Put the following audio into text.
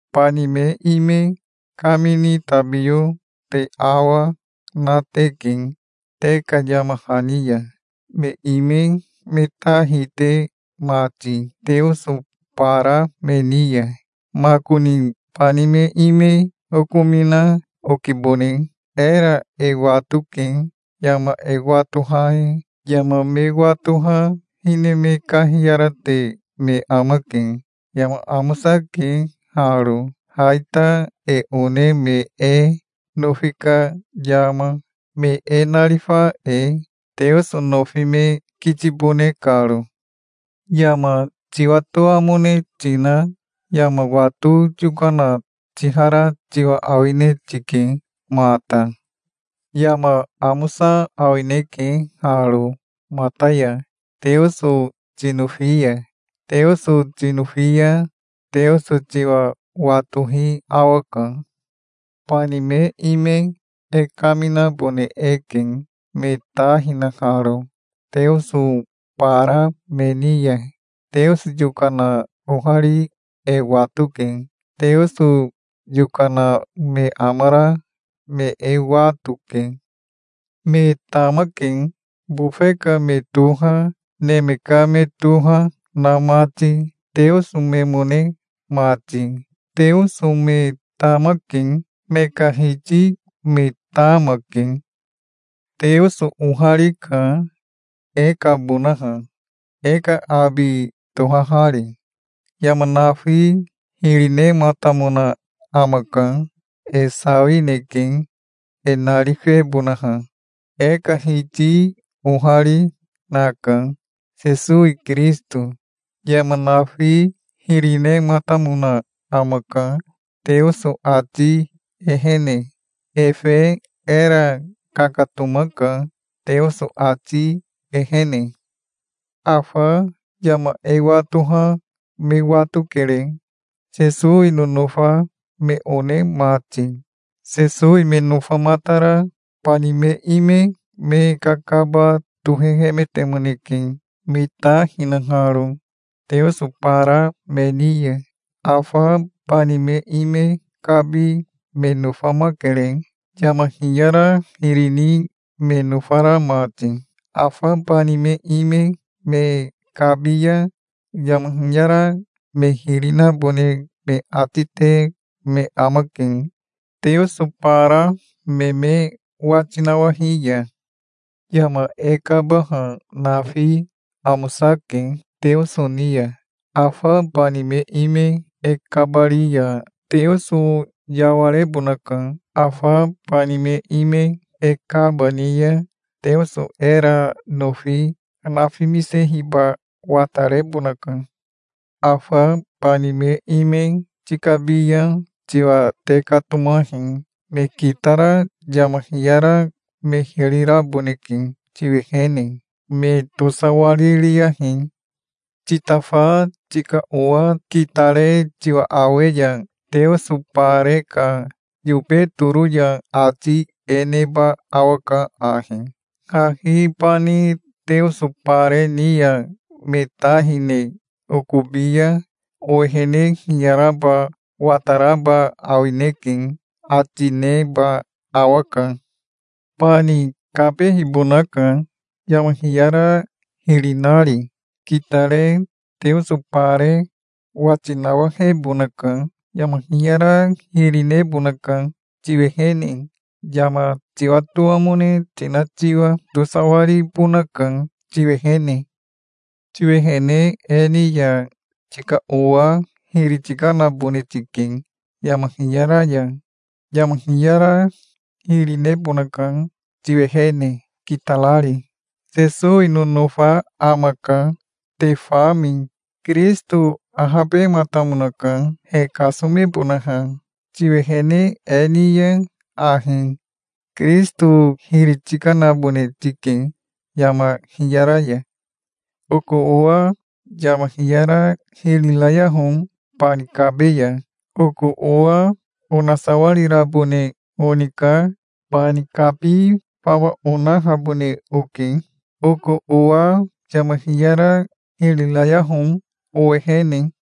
Bani me ime kamini tabiyo te awa, na teke te ka yama hani ya, me ime me ta hite mati teoso bara me ni ya. Makoni bani me ime okomina okibone. Era e watoke, yama e watoha e. Yama me watoha hine me kahiyarate me amake. Yama amosake haro, ha ita, e one me e nofi ka yama, me e narifa e, Teoso nofi me kitibone karo. Yama tiwatoamone tina yama wato yokana tihara tiwa awine tike mata. Yama amosa awineke haro mata ya, Teoso tinofi ya. Teoso tinofi ya Teoso tiwa watohi awaka. Bani me ime e kaminabone eke, me ta hinaharo teoso bara me ni ya. Teoso yokana ohari e watoke. Teoso yokana me amara me e wato, ke. Me tamake, bofe ka me toha, neme ka me toha na mati, teoso memone mati. Teoso me tamake. Me ka hiti me tama, ke. Teoso oharika, e kabonaha, e ka abi tohahari. Yama nafi hiri nematamona amaka. E sawineke e narifebonaha. E ka Hiti ohari, naka, Sesowi Kirisito. Yama nafi hiri nematamona amaka, Teoso ati ehene. Efe era kakatomaka, Teoso ati ehene. Afa yama e watoha me watokere, Sesowi nonofa me one mati. Sesowi me nofamatara bani me ime me kakaba tohehemetemoneke, me ta hinaharo teoso bara me ni ya. Afa bani me ime kabi me nofamakere, yama hiyara hiri ni me nofara mati. Afa bani me ime me kabi ya yama hiyara me hiri nabone me ati te me amake, teoso bara me me wati nawahi ya. Yama e kabaha nafi amosake Teoso ni ya. Afa bani me ime e kabari ya Teoso yawarebonaka. Afa bani me ime e kaba ni ya Teoso era nofi nafimisehiba watarebonaka. Afa bani me ime tikabi ya tiwa tekatomahi. Me kitara yama hiyara me hiri raboneke, tiwehene. Me tosawaririyahi. Titafa tika owa kitare tiwa awe ya teoso bare ka yobe toro ya, ati e neba awaka ahi: "Hahi bani teoso bare ni ya me ta hine okobi ya owehene hiyaraba wataraba awineke", ati neba awaka. Bani kabehibonaka, yama hiyara hiri nari. Kitare teoso bare wati nawahebonaka. Yama hiyara hiri nebonaka, tiwehene, yama tiwatoamone tina tiwa. Tosawaribonaka tiwehene. Tiwehene e ni ya tika owa hiri tikanabone tike yama hiyara ya. Yama hiyara hiri nebonaka tiwehene, kitarari. Sesowi nonofa amaka, te fami. Kirisito ahabematamonaka, he kasomebonaha. Tiwehene e ni ya ahi Kirisito hiri tikanabone tike yama hiyara ya. Oko owa yama hiyara hiri rayaho bani kabe ya. Oko owa onasawarirabone oni ka bani kabi fawa onahabone oke. Oko owa yama hiyara hiri rayaho owehene.